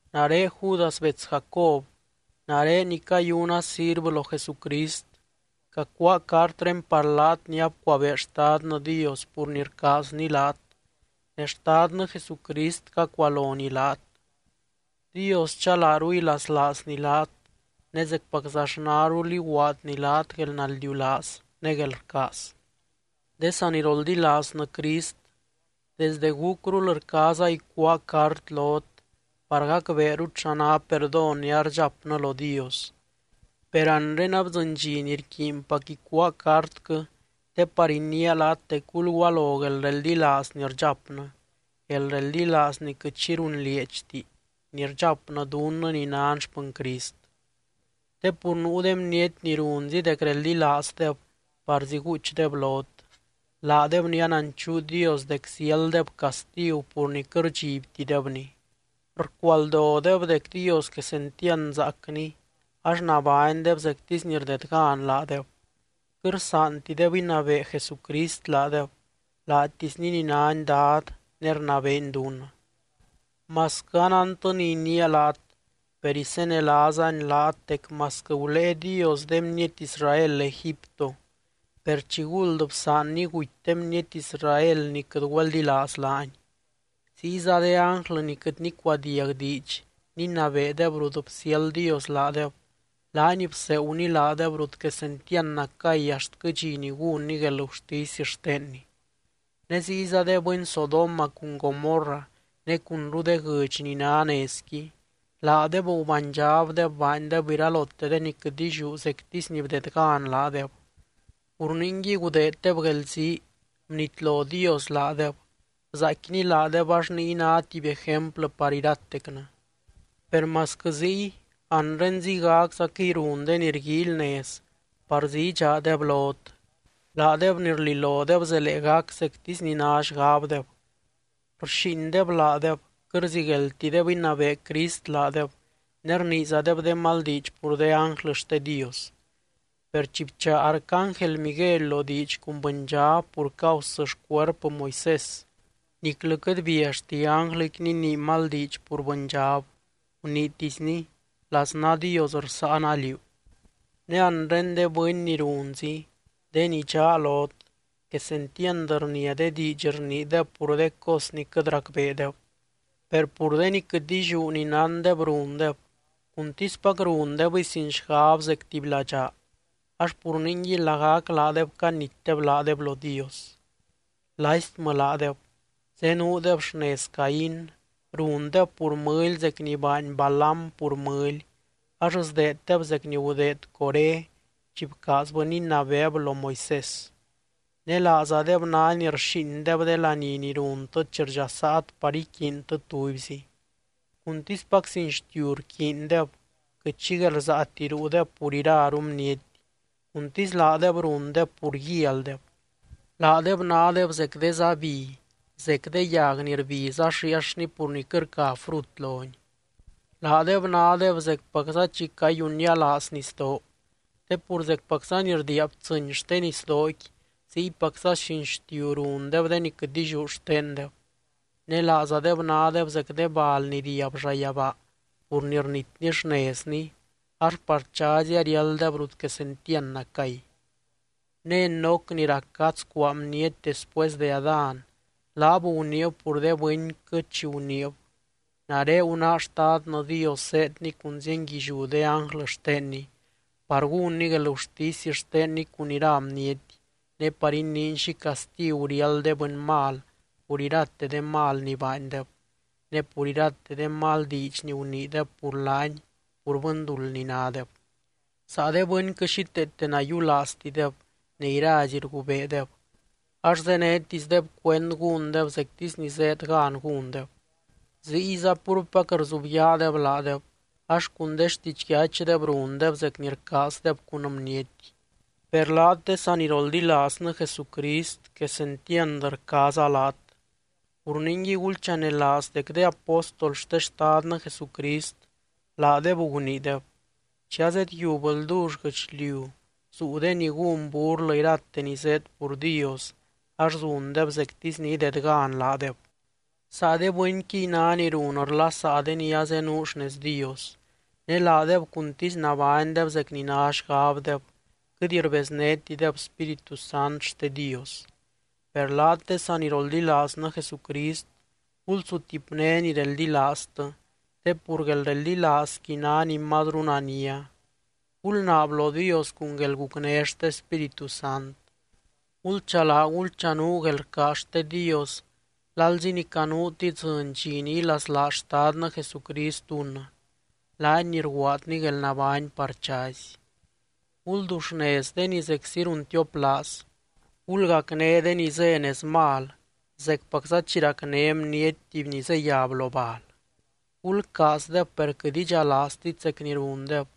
Nare Judas bets Jacob. Nare ni cayuna sirvɨ lo Jesucrist, cacuáa cartré par laat ni abcuabee Xtadnɨ Dios pur ni rcaazny laat ne Xtadnɨ Jesucrist cacualony laat. Dios chalaaru ilaslaazny laat, ne zecpaczaxnarul iguaadny laat guelnaldiulaaz ne guelrcaaz. De saniroldilaaznɨ Crist, desde gúcrul rcaaza icuáa cart lot par gacbeerut xa ná perdón ni ardxapnɨ lo Dios. Per anre abdzɨny dxi ni rquiinpac icuáa cartquɨ te par iniia laat dec gulgualo guelreldilaaz ni rdxapnɨ, guelreldilaaz ni quɨt xi runlieedxti ni rdxapnɨ dunnɨ ni nan xpɨny Crist. Te pur nuu de bniety ni runzi dec reldilaazdeb parzí guuchdeb lot, laadeb ni ananchuu Dios dec ziálddeb castigu pur ni quɨt rdxibtidebny. Rcualdodeb dec Dios quesentiand zaacny ax nabánydeb zectisy ni rdedgan laadeb. Quɨt rsaantideb inabee Jesucrist laadeb, laatisny ni nány Dad ne rnabeeny dunnɨ. Masquɨ anántɨ ni iniia laat, per isenelaazani laat dec masquɨ gulée Dios de bniety Israel Egipto, per chiguld bsaanny guty de bniety Israel ni quɨt güeldilaaz laany. Ziyza de ánglɨ ni quɨt nicuadiag diidx ninabeedeb rut bsiáld Dios laadeb, laany bseeguny laadeb rut quesentiand nacay axtquɨ dxi ni gúnny guelgurtisy xtenny. Ne ziyza de bɨny Sodoma cun Gomorra ne cunru de guɨdx ni ná nezqui, laadeb gubánydxabdeb baandeb iralote de ni quɨt illiú zectisy ni bdedgan laadeb. Pur ningui gudeeddeb guelzii bnitlo Dios laadeb, bzaaicquiny laadeb, ax niy ná tuby ejemplɨ par iratecnɨ. Per masquɨ ziy, anre ziygaczaquɨy run de ni rguíily nez parzí idxaadeb lot. Laadeb ni rlilodeb zelee gac zectisy ni ná xgabdeb, rxíindeb laadeb, quɨt rzigueldtideb inabee Crist laadeb ne rniizadeb de mal diidx pur de ánglɨ xte Dios. Per chi bchaa arcángel Miguely lo diidx cun bɨndxab pur causɨ xcuerpɨ Moisés, niclɨ quɨt biallti ánglɨqui ninii mal diidx pur bɨndxab, guniitisny: “Laznaa Dios rsáana liú.” Ne anre de bɨny ni runzi, de ni dxaa lot, quesentiand rnia de diidx rniideb pur de cos ni quɨt racbeedeb. Per pur de ni quɨt illiú ni nándeb rundeb, cuntispac rundebɨy sin xgab zec tuby ladxaa ax pur ningui lagac laadeb canitdeb laadeb lo Dios. ¡Laistmɨ laadeb! Zenuudeb xnez Caín, rundeb pur mɨly zec ni baany Balaam pur mɨly, ax sdeeddeb zec ni gudeed Coré chi bcaazbɨ ninabeeb lo Moisés. Ne laazadeb ná ni rxíindeb de laní ni runtɨ chi rdxasaat par iquiintɨ tubyzi. Cuntispac sin xtiu rquiindeb quɨt xi guelrsaati ruudeb pur iraru bniety, cuntisy laadeb rundeb pur guialdeb. Laadeb nádeb zec de zá bi, zec de yag ni rbiz ax riiaxni pur ni quɨt rca frut loni. Laadeb nádeb zecpacza chi cayunnialaaz nisdoo, te pur zecpacza ni rdiia btsɨ́ny xte nisdooqui ziypacza sin xtiu rundeb de ni quɨt illiú xtendeb. Ne laazadeb nádeb zec de bal ni riab llayabaa pur ni rnitni xnezni, ax par chazy ariálddeb rut quesentiand nacay. Ne Enoc ni rac gadz cuaa bniety después de Adán, laab guniib pur de bɨnquɨ chi guniib: “Nare gunáa Xtadnɨ Dios zéedny cun zienguilliú de ánglɨ xtenny par gúnny guelgurtisy xtenny cun ira bniety, ne par iniiny xi castigu riáld de bɨny mal pur irate de mal ni baandeb, ne pur irate de mal diidx ni guniideb pur laany pur bɨnduld ni nádeb.” Saa de bɨnquɨ xíteete nayiulaaztideb ne irazi rgubeedeb ax zénetisdeb cuend gúndeb zectisy ni zéed gan gúndeb. Ziyza púrpac rzubyaadeb laadeb, ax cun de xtidxyachdeb rundeb zec ni rcaazdeb cun bniety. Per laat, de saniroldilaaznɨ Jesucrist quesentiand rcaaza laat. Pur ningui, gulchanelaaz dec de apóstol xte Xtadnɨ Jesucrist laadeb guniideb: “Chi azedyiub ldull guɨchliu zuu de ni gún burlɨ irate ni zéed pur Dios, ax zundeb zectisy ni idedgan laadeb.” Saa de bɨnquiy ná ni run rlasaa de ni azenuu xnez Dios, ne laadeb cuntisy nabánydeb zec ni ná xgabdeb, quɨt rbeznétideb Spíritu Sant xte Dios. Per laat de saniroldilaaznɨ Jesucrist, gulsutipné ni reldilaaztɨ, te pur guelreldilaazqui ná ni mazru nania. Gulnaab lo Dios cun guelgucné xte Spíritu Sant. Gulchalaa gulchanuu guelrcaaz xte Dios lalzi ni canuut idzɨny dxi ni ilaslaaz Xtadnɨ Jesucrist dunnɨ, laany ni rguaadny guelnabány par chazy. Gulduxnez de ni zeczi runtioplaaz. Gulgacné de ni zé nez mal, zecpacza chi racné bniety tuby ni zeyab lo bal. Gulcaazdeb per quɨt idxalaaztit zec ni rundeb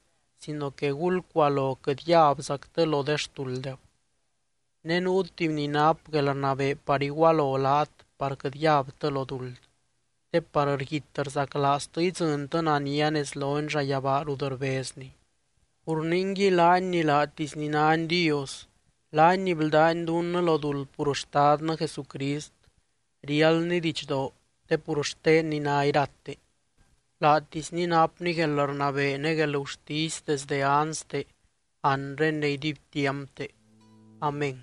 sino que gulcualo quɨt yabzactɨ lo de xtulddeb. Ne nuu tuby ni nap guelrnabee par igualo laat par quɨt yabtɨ lo duld, te par rguit rzaclaaztɨ idzɨntɨ nania nez lony llayabaa rut rbezny. Pur ningui, laany ni laatisny nány Dios, laany ni bldány dunnɨ lo duld pur Xtadnɨ Jesucrist, riáldny didxdoo te pur xtenny ná irate, laatisny napny guelrnabee ne guelgurtisy desdɨ anste, anre ne iduibtiampte. Amén.